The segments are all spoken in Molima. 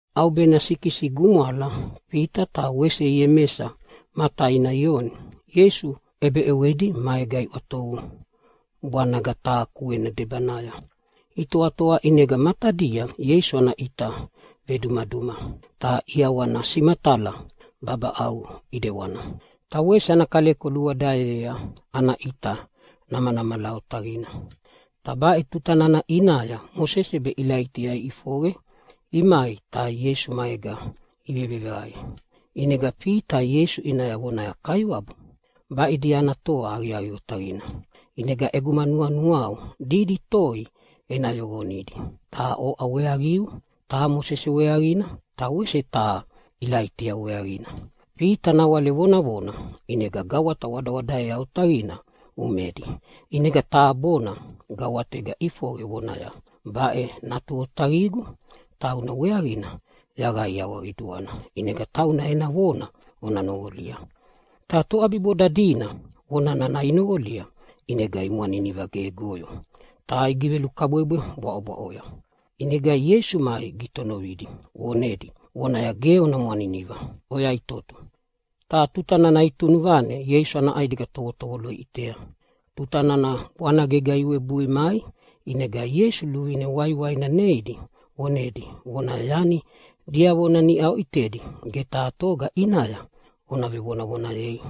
ʼAubena sikisi gumwala Fita ta wese Iemesa ma taina Ioni, Ieisu ʼebeʼewedi maega iʼwatovu bwanaga taha kuena debanaya. Itoatoa ʼinega matadia Ieisu ana ʼita vedumaduma ta ʼiawana simatala babaʼau ʼidewana, ta wese ana kaleko luwadaeyea ana ʼita namanamala otaqina. Ta baʼe tuta nana ʼinaya Mosese be Ilaitia iʼifoqe imai ta Ieisu maega iveveqae. ʼInega Fita Ieisu ʼinaya vonaya, “Kaiwabu, baʼidia ana toa aqiaqi otaqina, ʼinega ʼeguma nuanuau didi toi ena yoqonidi taha oʼa weaqiu, taha Mosese weaqina ta wese taha Ilaitia weaqina.” Fita nawale vonavona, ʼinega gawata wadawadaea otaqina umedi ʼinega taha bona gawatega ʼifoqe vonaya, “Baʼe Natu otaqigu, tauna weaqina yaqaiawa qiduana. ʼInega tauna ena vona ona noqolia.” Ta toʼabiboda dina vona nana inoqolia ʼinega imwaniniva ge goyo ta igivelukabwebwe bwaʼobwaʼoya. ʼInega Ieisu mai gitonovidi vonedi vonaya, “Ge ona mwaniniva, oyaʼitoto!” Ta tuta nana itunuvane Ieisu ana ʼaigeda tovotovolo iʼitea. Tuta nana bwanagega iwebui mai ʼinega Ieisu luvine waiwaina neidi vonedi vonaya, “Yani diavona niʼa oʼitedi ge taha toga ʼinaya ona vonavonayei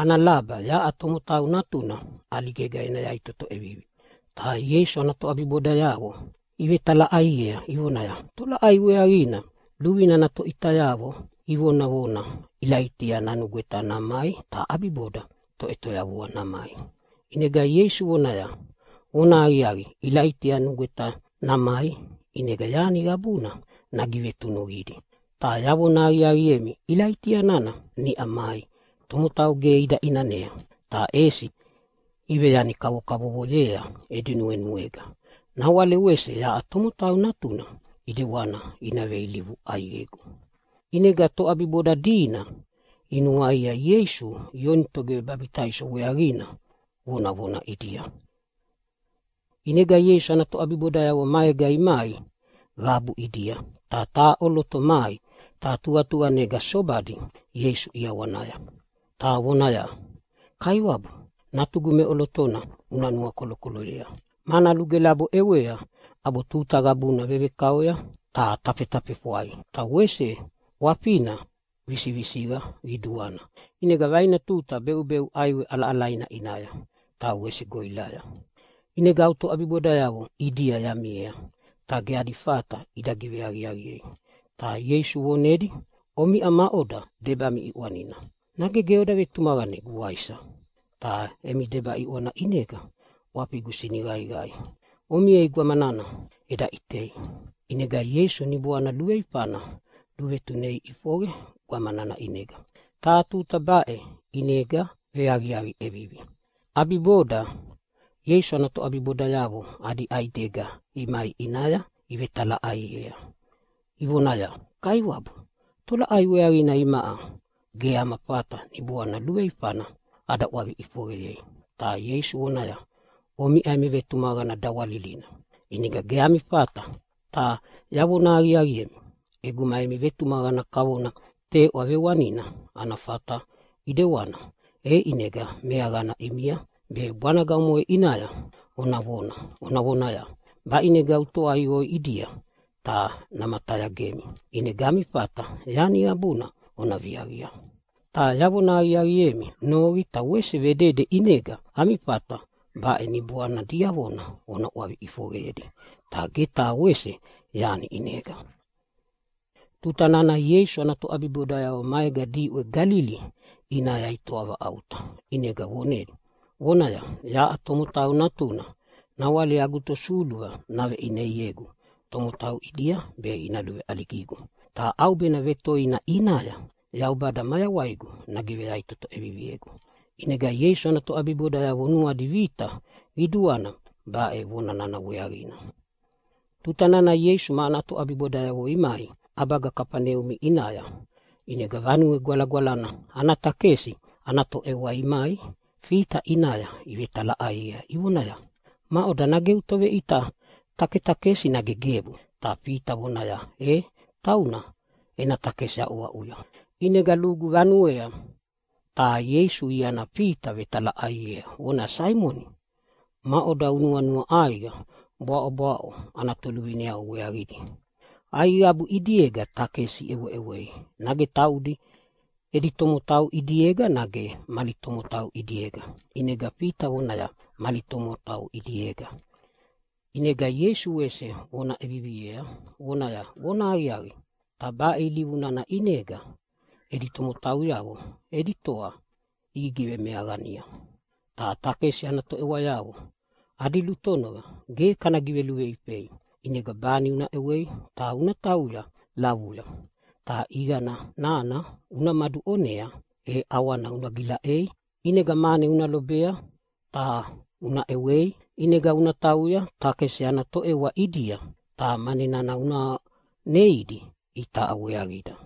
ana laba yaʼa Tomotau Natuna ʼaligega ena yaʼitoto ʼevivi.” Ta Ieisu ana toʼabibodayavo ivetalaʼaiea ivonaya, “Tolaʼai weaqina luvine ana toveʼitayavo ivonavona Ilaitia nanugweta namai ta ʼabiboda Toʼetoyavua namai?” ʼInega Ieisu vonaya, “Vonahaqiaqi, Ilaitia nugweta namai, ʼinega yani qabudi nagivetunuqidi, ta yavona aqiaqiemi Ilaitia nana niʼa mai ta tomotau ge ida ʼinanea, ta ʼesi iveyani kavokavovoyea edi nuenuega, nawale wese yaʼa Tomotau Natuna ʼidewani ina veilivu ʼaiqegu.” ʼInega toʼabiboda dina inuaia Ieisu Ioni Togivebabitaiso weaqina vonavona ʼidia. ʼInega Ieisu ana toʼabibodayavo maega imai qabu ʼidia, ta taha ʼoloto mai ta tuqatuqanega sobadi Ieisu ʼiawanaya, ta vonea vonaya, “Kaiwabu, natugu meʼolotona una nuakolokoloyea, mana lugelabo ʼewea ʼabo tuta qabuna vevekaoya ta tafetafefwai. Ta wese ʼwafina visivisiqa qiduana, ʼinega vaina tuta beʼubeʼu ʼaiwe ʼalaʼalaina ʼinaya ta wese goʼilaya. ʼInega au toʼabibodayavo ʼidia yamiea ta ge adi fata ida giveaqiaqiei.” Ta Ieisu vonedi, “Omiʼa maʼoda? Debami ʼiʼwanina! Nage ge oda vetumaqanegu, waisa? Ta emi deba ʼiʼwana ʼinega ʼwafigu siniqaiqai. Omiei gwamana eda ʼitei!” ʼInega Ieisu niboana luveifana luvetunei ʼifoqe gwama nana ʼinega, ta tuta baʼe ʼinega veaqiaqi ʼevivi. ʼAbiboda Ieisu ana toʼabibodayavo adi ʼaidega imai ʼinaya ivetalaʼaiea ivonaya, “Kaiwabu, tolaʼai weaqina imaʼa ge ama fata niboana luveifana ada ʼwavi ʼifoqeyei?” Ta Ieisu vonaya, “Omiʼa emi vetumaqana dawalilina, ʼinega ge ami fata. Ta yavona aqiaqiemi, ʼeguma emi vetumaqana kavona teʼwa vewanina ana fata ʼidewana, e ʼinega meaqana ʼimia be bwanaga omoʼe ʼinaya ona vonaya, ‘Baʼinega utoaiqo oiʼidia!’ ta namatayagemi. ʼInega ami fata yani qabuna ona viaqia. Ta yavona aqiaqiemi, noqi ta wese vedede ʼinega ami fata baʼe niboana diavona ona ʼwavi ʼifoqeyedi. Ta ge taha wese yani ʼinega.” Tuta nana Ieisu ana toʼabibodayavo maega diʼwe Galili ʼinaya itoa vaʼauta, ʼinega vonedi vonaya, “Yaʼa Tomotau Natuna nawale agu tosuluva naveʼineiegu tomotau ʼidia be ina luveʼaligigu, ta ʼaubena vetoina ʼinaya Yaubada mayawaigu nagiveyaʼitoto ʼeviviegu.” ʼInega Ieisu ana toʼabibodayavo nuadi vita qiduana baʼe vonana weaqina. Tuta nana Ieisu ma ana toʼabibodayavo imai ʼabaga Kafaneumi ʼinaya, ʼinega Vanue Gwalagwalana ana takesi ana toʼewa imai Fita ʼinaya ivetalaʼaiea ivonaya, “Maʼoda, nage eu toveʼita taketakesi, nage gebu?” Ta Fita vonaya, “E, tauna ena takesi aʼuaʼuya.” ʼInega lugu vanuea ta Ieisu iana Fita vetalaʼaiea vonaya, “Saimoni, maʼoda unuanua ʼaiqa bwaʼobwaʼo ana toluvineavo weaqidi? Aiqabu ʼidiega takesi iʼeweʼewei, taudi edi tomotau ʼidiega, nage mali tomotau ʼidiega?” ʼInega Fita vonaya, “Mali tomotau ʼidiega.” ʼInega Ieisu wese vona ʼevivi vonaya, “Vonahaqiaqi, ta baʼe ilivu nana ʼinega edi tomotauyavo edi toa igigivemeaqania. Ta takesi ana toʼewayavo adi lutonova ge kana giveluveifei. ʼInega bani una ʼewei ta una tauya lavuya ta ʼiqani nana umaduʼonea e ʼawana una gilaʼei, ʼinega mane una lobea ta una ʼewei. ʼInega una tauya takesi ana toʼewa ʼidia ta mane nana una neidi itaʼa weaqida.”